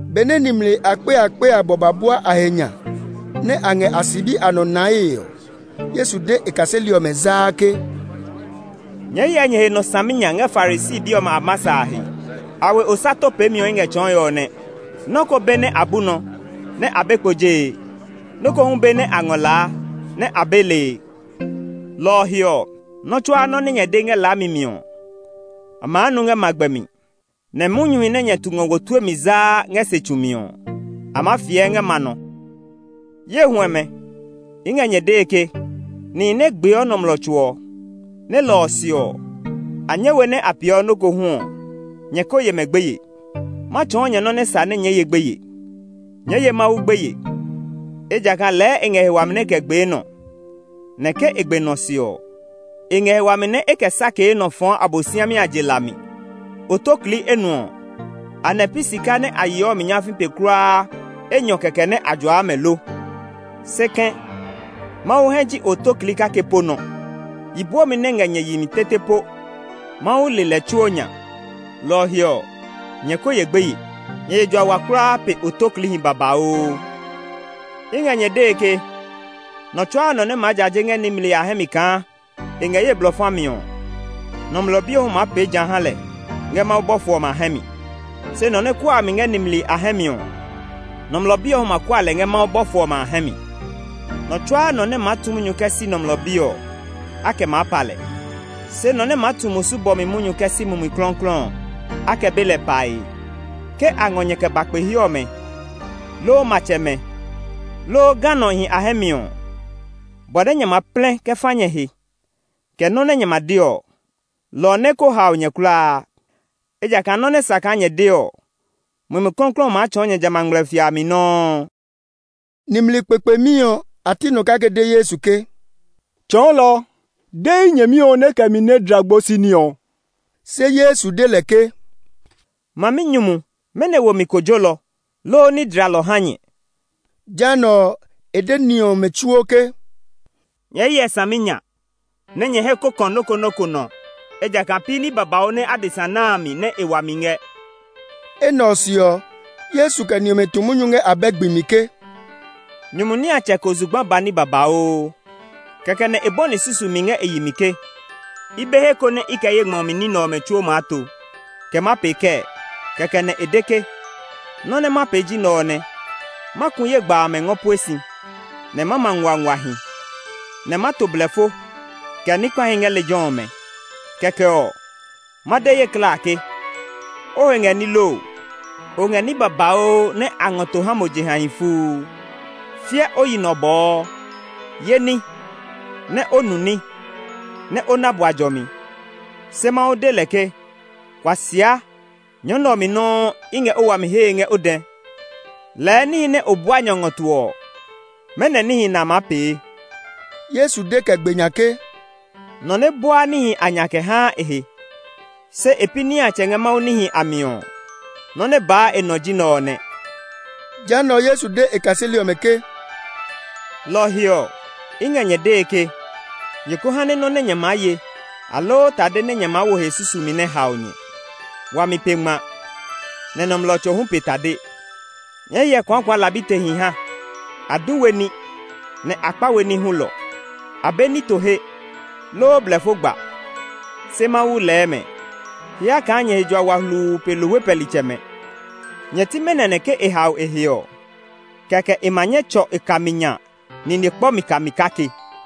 Benɛ nimli akpe abɔ akpe ba bua a he nya, nɛ a ngɛ a sibi a nɔ nae ɔ, Yesu de e kaseli ɔmɛ zaa ke, “Nyɛɛ hyɛ nyɛ he nɔ saminya ngɛ Farisi bi ɔmɛ a masa a he; a we osato peemi ɔ i ngɛ tsɔɔe ɔ nɛ. Nɔ́ ko be nɛ a bu nɔ, nɛ a be kpo jee; nɛ nɔ́ ko hu be nɛ a ngɔ laa, nɛ a be lee. Lɔ ɔ he ɔ, nɔ́ tsuaa nɔ́ nɛ nyɛ de ngɛ laami mi ɔ, a maa nu ngɛ magbɛ mi; nɛ munyuhi nɛ nyɛ tu ngɔ wo tue mi zaa ngɛ se tsu mi ɔ, a maa fiɛ ngɛ ma nɔ. “Ye huɛmɛ, i ngɛ nyɛ dee ke, nihi nɛ gbeɔ nɔmlɔ tso ɔ, nɛ lɔ ɔ se ɔ, a nyɛ we nɛ a peeɔ nɔ́ ko hu ɔ, nyɛ ko ye mɛ gbeye. Ma tsɔɔ nyɛ nɔ nɛ sa nɛ nyɛɛ ye gbeye. Nyɛɛ ye Mawu gbeye, ejakaa lɛɛ e ngɛ he wami nɛ e kɛ gbee nɔ, nɛ ke e gbe nɔ ɔ se ɔ, e ngɛ he wami nɛ e kɛ sakee nɔ ɔ kɛ fɔɔ Abosiami a je la a mi. “Otoklii enuɔ ɔ, anɛ pi sika nɛ a yes mi nyafii pe kulaa enyɔ kɛkɛ nɛ a juaa mɛ lo? Se kɛ̃, Mawu hɛ ji otoklii kake po nɔ. Yi bwɔmi nɛ ngɛ nyɛ yi mi tete po Mawu le lɛ tsuo nya. Lɔ ɔ he ɔ, nyɛ ko ye gbeye; nyɛ he jua wa kulaa pe otokliihi babauu! “I ngɛ nyɛ dee ke, nɔ tsuaa nɔ nɛ maa jaje ngɛ nimli a hɛ mi kaa e ngɛ ye blɔ fa mi ɔ, Nɔmlɔ Bi ɔ hu maa pee ja ha lɛ ngɛ Mawu bɔfo ɔmɛ a hɛ mi. Se nɔ nɛ kuaa mi ngɛ nimli a hɛ mi ɔ, Nɔmlɔ Bi ɔ hu ma kua lɛ ngɛ Mawu bɔfo ɔmɛ a hɛ mi. “Nɔ tsuaa nɔ nɛ maa tu munyu kɛ si Nɔmlɔ Bi ɔ, a kɛ maa pa lɛ; se nɔ nɛ maa tu musu bɔmi munyu kɛ si Mumi Klɔuklɔu ɔ, a kɛ be lɛ pae. “Ke a ngɔ nyɛ kɛ ba kpe he ɔmɛ, loo matsɛmɛ, loo ganɔhi a hɛ mi ɔ, bɔ nɛ nyɛ ma plɛ kɛ fa nyɛ he, kɛ nɔ́ nɛ nyɛ ma de ɔ, lɔ ɔ nɛ ko hao nyɛ kulaa. Ejakaa nɔ́ nɛ sa kaa nyɛ de ɔ, Mumi Klɔuklɔu ɔ maa tsɔɔ nyɛ jamɛ a ngmlɛfia a mi nɔuu.” Nimli kpekpemi ɔ a ti nɔ kake de Yesu ke, “Tsɔɔlɔ, de ye nyɛmi ɔ nɛ e kɛ mi nɛ dla gbosi ní ɔ.” Se Yesu de lɛ ke, “Maminyumu, mɛnɔ wo mi kojolɔ, loo ní dlalɔ ha nyɛ?” Jehanɛ ɔ, e de ni ɔmɛ tsuo ke, “Nyɛɛ hyɛ saminya, nɛ nyɛ hɛ ko kɔ nɔ́ ko nɔ́ ko nɔ; ejakaa pi ní babauu nɛ adesa na a mi nɛ e wami ngɛ.” Enɛ ɔ se ɔ, Yesu kɛ ni ɔmɛ tu munyu ngɛ abɛ gbi mi ke, “Nyumu niatsɛ ko zugba ba ní babauu. Kɛkɛ nɛ e bɔni susumi ngɛ e yi mi ke, ‘I be he ko nɛ i kɛ ye ngmɔ mi ní nɛ ɔmɛ tsuo maa to. Kɛ ma pee kɛɛ?’ Kɛkɛ nɛ e de ke, ‘Nɔ́ nɛ ma pee ji nɛ ɔ nɛ. Ma ku ye gba amɛ ngɔ pue si, nɛ ma ma nguanguahi, nɛ ma to blɛfo, kɛ ní kpahi ngɛ lejɛ ɔmɛ. Kɛkɛ ɔ, ma de ye klaa ke, o he ngɛ ní loo! O ngɛ ní babauu nɛ a ngɔ to ha mo jehahi fuu. Fiɛ o yi nɔ bɔɔ! Yé ní, nɛ o nu ní, nɛ o na bua jɔmi!’ Se Mawu de lɛ ke, ‘Kuasia! Nyɔ nɛ ɔ mi nɔuu i ngɛ o wami ɔ hee ngɛ o dɛ. Lɛɛ níhi nɛ o bua nya ngɔ to ɔ, mɛnɔ níhi nɛ a maa pee?’” Yesu de kɛ gbe nya ke, “Nɔ nɛ buaa níhi a nya kɛ haa e he, se e pi niatsɛ ngɛ Mawu níhi a mi ɔ, nɔ́ nɛ baa e nɔ ji nɛ ɔ nɛ.” Jehanɛ ɔ, Yesu de e kaseli ɔmɛ ke, “Lɔ ɔ he ɔ, i ngɛ nyɛ dee ke, nyɛ ko ha nɛ nɔ́ nɛ nyɛ maa ye, aloo tade nɛ nyɛ maa wo he susumi nɛ hao nyɛ. Wami pe ngma, nɛ nɔmlɔ tso ɔ hu pe tade. Nyɛɛ hyɛ kuakualabitehi ha; a du we ní, nɛ a kpa we ní hulɔ; a be nito he, loo blɛfo gba; se Mawu lɛɛ mɛ! Hyɛ kaa nyɛ he jua wa hluu pe lohwe pɛlitsɛmɛ! Nyɛ ti mɛnɔ nɛ ke e hao e he ɔ, kɛkɛ e ma nyɛ tsɔ e kami nya nine kpɔ mi kami kake.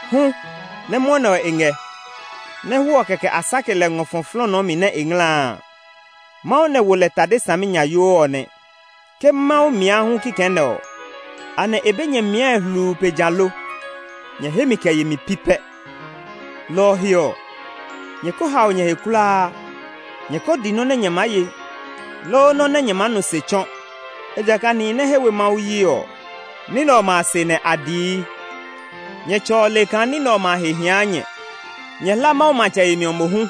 Hu, nɛ mwɔnɛ ɔ e ngɛ, nɛ hwɔɔ kɛkɛ a sake lɛ ngɔ fɔ flɔɔnɔɔ mi nɛ e ngla a, Mawu lɛ wo lɛ tade saminyayoo ɔ nɛ. Ke Mawu mia hu kikɛ nɛ ɔ, anɛ e be nyɛ miae hluu pe ja lo? Nyɛ hemi kɛ yemi pi pɛ! “Lɔ ɔ he ɔ, nyɛ ko hao nyɛ he kulaa; nyɛ ko di nɔ́ nɛ nyɛ maa ye, loo nɔ́ nɛ nyɛ maa nu se tsɔ. Ejakaa nihi nɛ he we Mawu yi ɔ, ní nɛ ɔmɛ a se nɛ a dii. Nyɛ Tsɛ ɔ le kaa ní nɛ ɔmɛ a he hia nyɛ. Nyɛ hla Mawu matsɛ yemi ɔ mohu,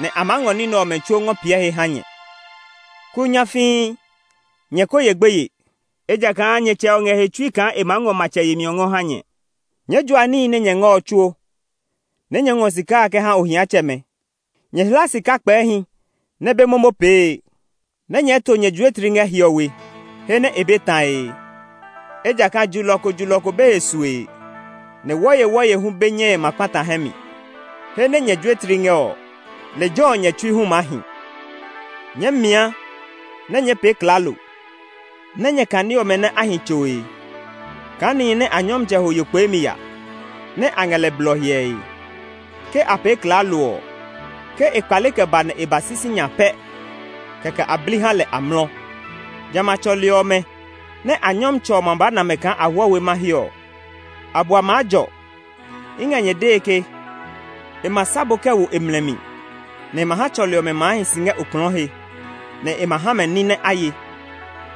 nɛ a maa ngɔ ní nɛ ɔmɛ tsuo ngɔ piɛ he ha nyɛ. “Kuu nyafii, nyɛ ko ye gbeye; ejakaa nyɛ Tsɛ ɔ ngɛ he tsui kaa e maa ngɔ matsɛ yemi ɔ ngɔ ha nyɛ. Nyɛɛ jua níhi nɛ nyɛ ngɛ ɔ tsuo, nɛ nyɛɛ ngɔ sika a kɛ ha ohiatsɛmɛ. Nyɛ hla sika kpɛɛhi nɛ be momo pee, nɛ nyɛɛ to nyɛ juetli ngɛ hiɔwe he nɛ e be tae ngɛ. Ejakaa julɔ ko julɔ ko be he sue, nɛ wɔyewɔye hu be nyɛe ma kpata hɛ mi. He nɛ nyɛ juetli ngɛ ɔ, lejɛ ɔ nyɛ tsui hu maa hi. “Nyɛɛ mia, nɛ nyɛɛ pee klaalo; nɛ nyɛ kane ɔmɛ nɛ a hi tsoe kaa nihi nɛ a nyɔmtsɛ ho yo kpeemi ya, nɛ a ngɛ lɛ blɔ hyɛe. Ke a pee klaalo ɔ, ke e kpale kɛ ba nɛ e ba si sinya pɛ kɛkɛ a bli ha lɛ amlɔ. Jamɛ a tsɔli ɔmɛ nɛ a nyɔmtsɛ ɔ ma ba na mɛ kaa a hwɔ we mahe ɔ, a bua maa jɔ! I ngɛ nyɛ dee ke, e ma sa bo kɛ wo e mlɛ mi, nɛ e ma ha tsɔli ɔmɛ maa hi si ngɛ okplɔɔ he, nɛ e ma ha mɛ ní nɛ a ye.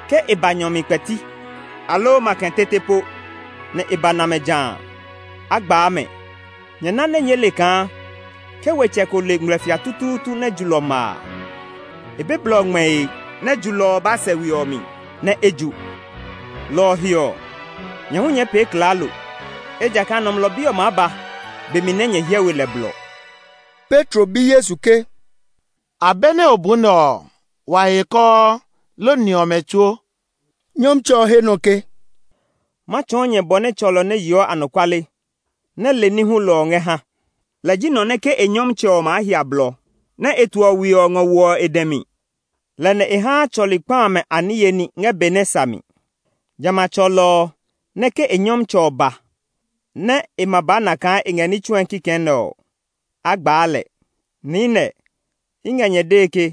Ke e ba nyɔ mi kpɛti, aloo makɛ tete po, nɛ e ba na mɛ jã a, a gbaa mɛ! Nyɛ na nɛ nyɛɛ le kaa ke wetsɛ ko le ngmlɛfia tutuutu nɛ julɔ ma a, e be blɔ ngmɛe nɛ julɔ ɔ ba sɛ e we ɔ mi, nɛ e ju. Lɔ ɔ he ɔ, nyɛ hu nyɛɛ pee klaalo, ejakaa Nɔmlɔ Bi ɔ maa ba be mi nɛ nyɛ hyɛ we lɛ blɔ.” Petro bi Yesu ke, “Abɛ nɛ o bu nɛ ɔ, wa he e kɔɔ, loo ni ɔmɛ tsuo?” Nyɔmtsɛ ɔ he nɔ ke, “Ma tsɔɔ nyɛ bɔ nɛ tsɔlɔ nɛ yeɔ anɔkuale, nɛ le ní hulɔ ɔ ngɛ ha. Lɛ ji nɔ nɛ ke e nyɔmtsɛ ɔ maa hia blɔ, nɛ e toɔ we ɔ ngɔ woɔ e dɛ mi; lɛ nɛ e haa tsɔli kpa amɛ a niye ní ngɛ be nɛ sa mi. Jamɛ a tsɔlɔ ɔ nɛ ke e nyɔmtsɛ ɔ ba nɛ e ma ba na kaa e ngɛ ní tsue kikɛ nɛ ɔ, a gbaa lɛ! Niinɛ, i ngɛ nyɛ dee ke,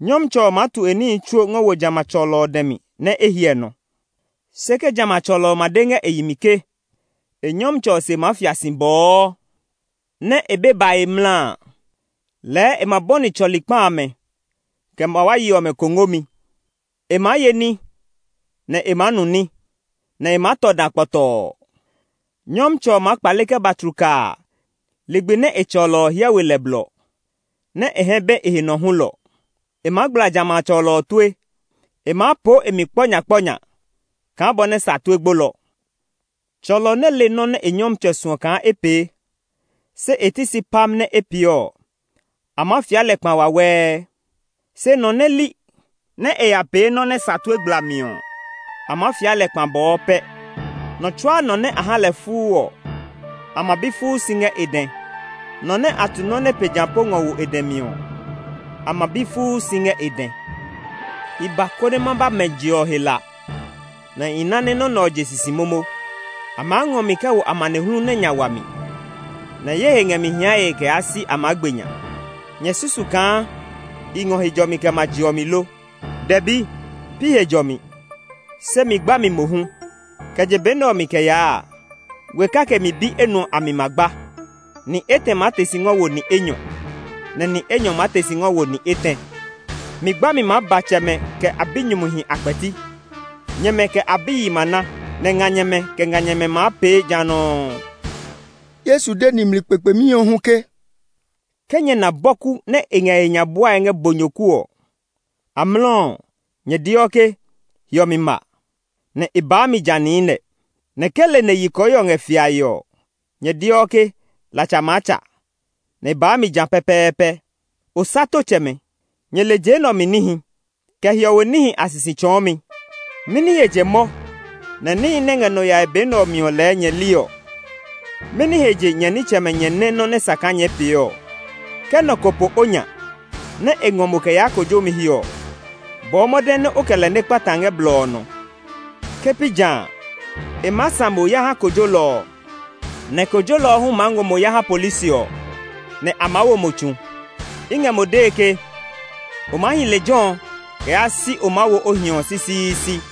nyɔmtsɛ ɔ maa tu e níhi tsuo ngɔ wo jamɛ a tsɔlɔ ɔ dɛ mi nɛ e hyɛ nɔ. Se ke jamɛ a tsɔlɔ ɔ ma de ngɛ e yi mi ke e nyɔmtsɛ ɔ se ma ya fia si bɔɔ, nɛ e be bae mla a, lɛɛ e ma bɔni tsɔli kpa amɛ, kɛ mawayi ɔmɛ kongomi. E maa ye ní, nɛ e maa nu ní, nɛ e maa tɔ dã kpɔtɔɔ. Nyɔmtsɛ ɔ maa kpale kɛ ba tlukaa ligbi nɛ e tsɔlɔ ɔ hyɛ we lɛ blɔ, nɛ́ e hɛ be e he nɔ hulɔ. E maa gbla jamɛ a tsɔlɔ ɔ tue; e maa poo e mi kpɔ nya kpɔ nya kaa bɔ nɛ sa tue gbolɔ. “Tsɔlɔ nɛ le nɔ́ nɛ e nyɔmtsɛ ɔ suɔ kaa e pee, se e ti si pam nɛ e pee ɔ, a maa fia lɛ kpa wawɛɛ. Se nɔ nɛ li, nɛ e ya pee nɔ́ nɛ sa tue gblami ɔ, a maa fia lɛ kpa bɔɔ pɛ. Nɔ tsuaa nɔ nɛ a ha lɛ fuu ɔ, a ma bi fuu si ngɛ e dɛ; nɔ nɛ a tu nɔ́ nɛ pe ja po ngɔ wo e dɛ mi ɔ, a ma bi fuu si ngɛ e dɛ. “I ba, konɛ ma ba mɛ je ɔ he la, nɛ i ná nɛ nɔ́ nɛ ɔ je sisi momo! A maa ngɔ mi kɛ wo amanehlu nɛ nya wa mi, nɛ ye he ngɛ mi hiae kɛ yaa si a maa gbe nya! Nyɛ susu kaa i ngɔ he jɔmi kɛ ma je ɔ mi lo? Dɛbi, pi he jɔmi, se mi gbami mohu. Kɛ je be nɛ ɔ mi kɛ yaa a, we kake mi bi enuɔ a mi ma gba: ni etɛ maa te si ngɔ wo ni enyɔ, nɛ ni enyɔ maa te si ngɔ wo ni etɛ. Mi gbami maa ba tsɛmɛ kɛ a binyumuhi a kpɛti; nyɛmɛ kɛ a biyihi ma ná, nɛ nganyɛmɛ kɛ nganyɛmɛ hu maa pee ja nɔuu.” Yesu de nimli kpekpemi ɔ hu ke, “Ke nyɛ na bɔku nɛ ngɛ e he nya buae ngɛ bonyoku ɔ, amlɔ ɔ, nyɛ deɔ ke, ‘Hiɔmi ma’, nɛ e baa mi ja niinɛ. Nɛ ke leneyi kɔɔhiɔ ngɛ fiae ɔ, nyɛ deɔ ke, ‘Latsa maa tsa’, nɛ e baa mi ja pɛpɛɛpɛ. Osatotsɛmɛ! Nyɛ le je nɛ ɔ mi níhi, kɛ hiɔwe níhi a sisi tsɔɔmi. Mɛni he je mɔ nɛ níhi nɛ ngɛ nɔ yae be nɛ ɔ mi ɔ lɛɛ nyɛ li ɔ? “Mɛni he je nyɛ nitsɛmɛ nyɛ nɛ nɔ́ nɛ sa kaa nyɛɛ pee ɔ? Ke nɔ ko po o nya, nɛ e ngɔ mo kɛ yaa kojomi he ɔ, bɔɔ mɔde nɛ o kɛ lɛ nɛ kpata ngɛ blɔ ɔ nɔ. Ke pi ja a, e maa sã mo ya ha kojolɔ ɔ, nɛ kojolɔ ɔ hu maa ngɔ mo ha polisi ɔ, nɛ a maa wo mo tsu. I ngɛ mo dee ke, o maa hi lejɛ ɔ kɛ yaa si o maa wo o hiɔ ɔ sisiisi.”